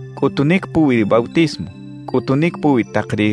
cꞌutunic puwi ri bautismo, cꞌutunic puwi tak ri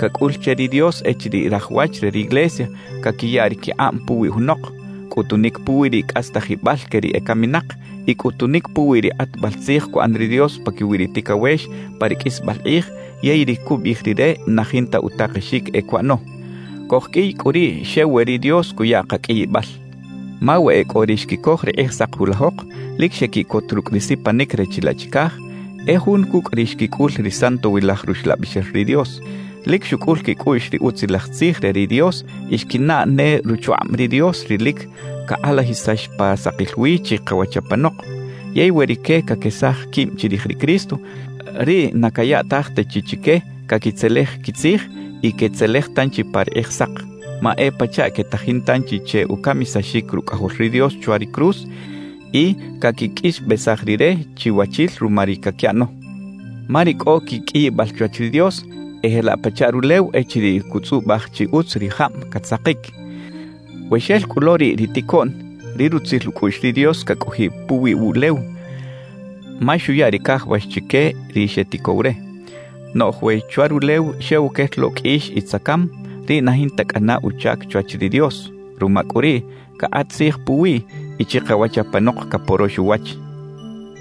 cacꞌul che ri Dios echiriꞌ raj wach re riglesia caquiya ri quikꞌab puwi junok, cꞌutunic puwi ri cꞌastajibal que ri ecaminak y cꞌutunic puwi ri kꞌatbal tzij cuꞌan ri Dios paquiwi ri ticawex pa ri qꞌuisbal kꞌij yey ri cubiꞌij Rire na jinta utakexic e cuꞌano. Cojqꞌuiy cꞌu riꞌ xew we ri Dios cuya kaqꞌuiyibal. Ma we e cꞌo ri xquicoj ri Kꞌijsak julajok, lic xequiꞌcot rucꞌ ri sipanic re chilaꞌ chicaj, e jun cucꞌ ri xquicꞌul ri Santowilaj Ruxlabixel ri Dios, lic xucꞌul quicꞌuꞌx ri Utzilaj Tzij re ri Dios y xquinaꞌ ne ruchukꞌab ri Dios ri lic cakꞌalajisax pa sakil wi chikawach apanok; yey we rique caquesaj quib chirij ri Cristo, riꞌ na cayaꞌtaj ta chi chique caquitzelej quitzij y quetzelej tanchi pa ri Kꞌijsak. Ma e pachaꞌ quetajin tanchi che ucamisaxic Rucꞌajol ri Dios chwa ri cruz y caquiqꞌuixbesaj Rire chiwachil ruma ri caquiꞌano. Ma ri cꞌo quiqꞌuiyibal chwach ri Dios e jelaꞌ pachaꞌ rulew echiriꞌ cutzꞌubaj chi utz ri jab catzakic. We xel cꞌu lo riꞌ ri ticoꞌn, ri rutzil ucꞌuꞌx ri Dios cacꞌojiꞌ puwi wuꞌlew, ma xuya ri cajawax chique ri xeticow re. Noꞌj we chwa rulew xew quel lo qꞌuix y tzacam, riꞌ na jinta cꞌana uchac chwach ri Dios. Ruma cꞌu riꞌ, cakꞌat tzij puwiꞌ y chikawach apanok caporox uwach.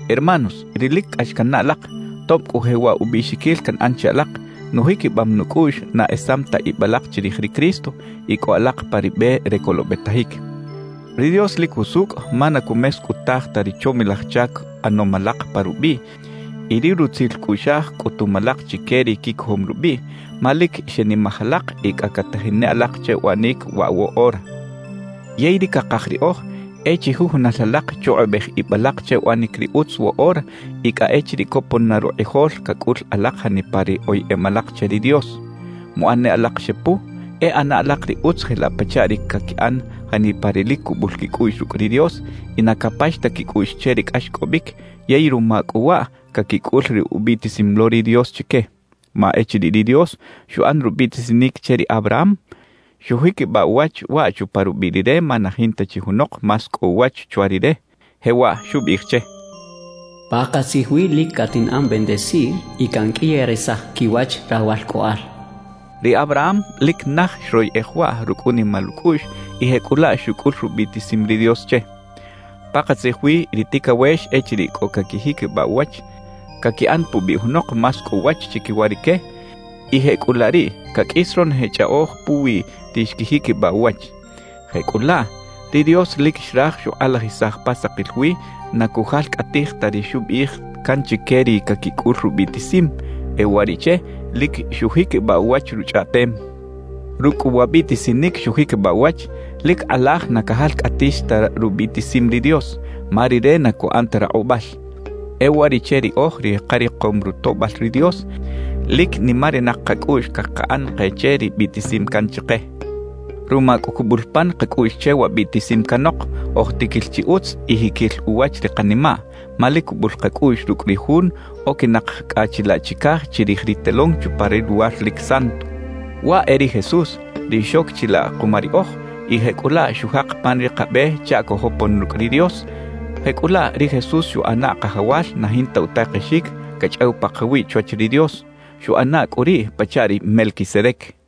Hermanos ri lic cꞌax cannaꞌ alak, tob cꞌu jewaꞌ ubiꞌxiquil canꞌan che alak, nujiquibam nucꞌuꞌx na esam ta ib alak chirij ri Cristo y cꞌo alak pa ri be re colobetajic. Ri Dios lic jusucꞌ ma na cumescꞌutaj ta ri chomilaj chac ꞌanom alak pa rubiꞌ y ri rutzil cꞌuꞌxaj cꞌutum alak chique ri quicojom rubiꞌ, ma lic xenimaj alak y cꞌa catajin ne alak che uꞌanic waꞌ woꞌora. Yey ri cakaj riꞌoj e chijujunal alak chukꞌubej ib alak che uꞌanic ri utz woꞌora y cꞌa echiriꞌ copon na rukꞌijol cacꞌul alak janipa ri oyeꞌem alak che ri Dios. Muꞌan ne alak xepu, e ꞌana alak ri utz jelaꞌ pachaꞌ ri caquiꞌan janipa ri lic cubul quicꞌuꞌx rucꞌ ri Dios y na capax ta quicꞌuꞌx che ri cꞌaxcꞌobic yey ruma cꞌu waꞌ caquicꞌul ri ubiꞌtisim lo ri Dios chique. Ma echiriꞌ ri Dios xuꞌan rubiꞌtisinic che ri Abraham, xujiquibaꞌ uwach waꞌ chupa rubiꞌ Rire ma na jinta chi junok más cꞌo uwach chwa Rire. Jewaꞌ xubiꞌij che: Pakatzij wi lic catinꞌan bendecir y canqꞌuiyarisaj quiwach rawalcꞌoꞌal xchaꞌ. Ri Abraham lic naj xroyeꞌej waꞌ rucꞌ unimal ucꞌuꞌx y jecꞌulaꞌ xucꞌul rubiꞌtisim ri Dios che. Pakatzij wi ri ticawex echiriꞌ cꞌo caquijiquibaꞌ uwach, caquiꞌan pubiꞌ junok más cꞌo uwach chiquiwa rique; y jecꞌulaꞌ riꞌ caqꞌuis ronoje chꞌaꞌoj puwi ri xquijiquibaꞌ uwach. Jecꞌulaꞌ, ri Dios lic xraj xukꞌalajisaj pa sakil wi na cujalcꞌatij ta ri xubiꞌij can chique ri caquicꞌul rubiꞌtisim; e uwariꞌche lic xujiquibaꞌ uwach Ruchꞌaꞌtem. Rucꞌ cꞌu wa biꞌtisinic xujiquibaꞌ uwach, lic kꞌalaj na cajalcꞌatix ta rubiꞌtisim ri Dios, ma Rire na cuꞌan ta rakꞌubal. E uwariꞌche riꞌoj ri karikom rutoꞌbal ri Dios, lic nimarinak kacꞌuꞌx cakaꞌan ke che ri biꞌtisim can chike. Ruma cꞌu cubul pan kacꞌuꞌx che wa biꞌtisim canok, oj tiquil chi utz y jiquil uwach ri kanimaꞌ, ma lic cubul kacꞌuꞌx rucꞌ ri Jun oquinak cꞌa chilaꞌ chicaj chirij ri telón chupa ri Luwar lic Santo. Waꞌ e ri Jesús, ri xoc chilaꞌ kuma riꞌoj; y jecꞌulaꞌ xujak pan ri kabe chaꞌ cojopon rucꞌ ri Dios. Jecꞌulaꞌ, ri Jesús xuꞌana Kajawal na jinta utakexic cachꞌaw pakawiꞌ chwach ri Dios; xuꞌana cꞌu riꞌ pachaꞌ ri Melquisedec.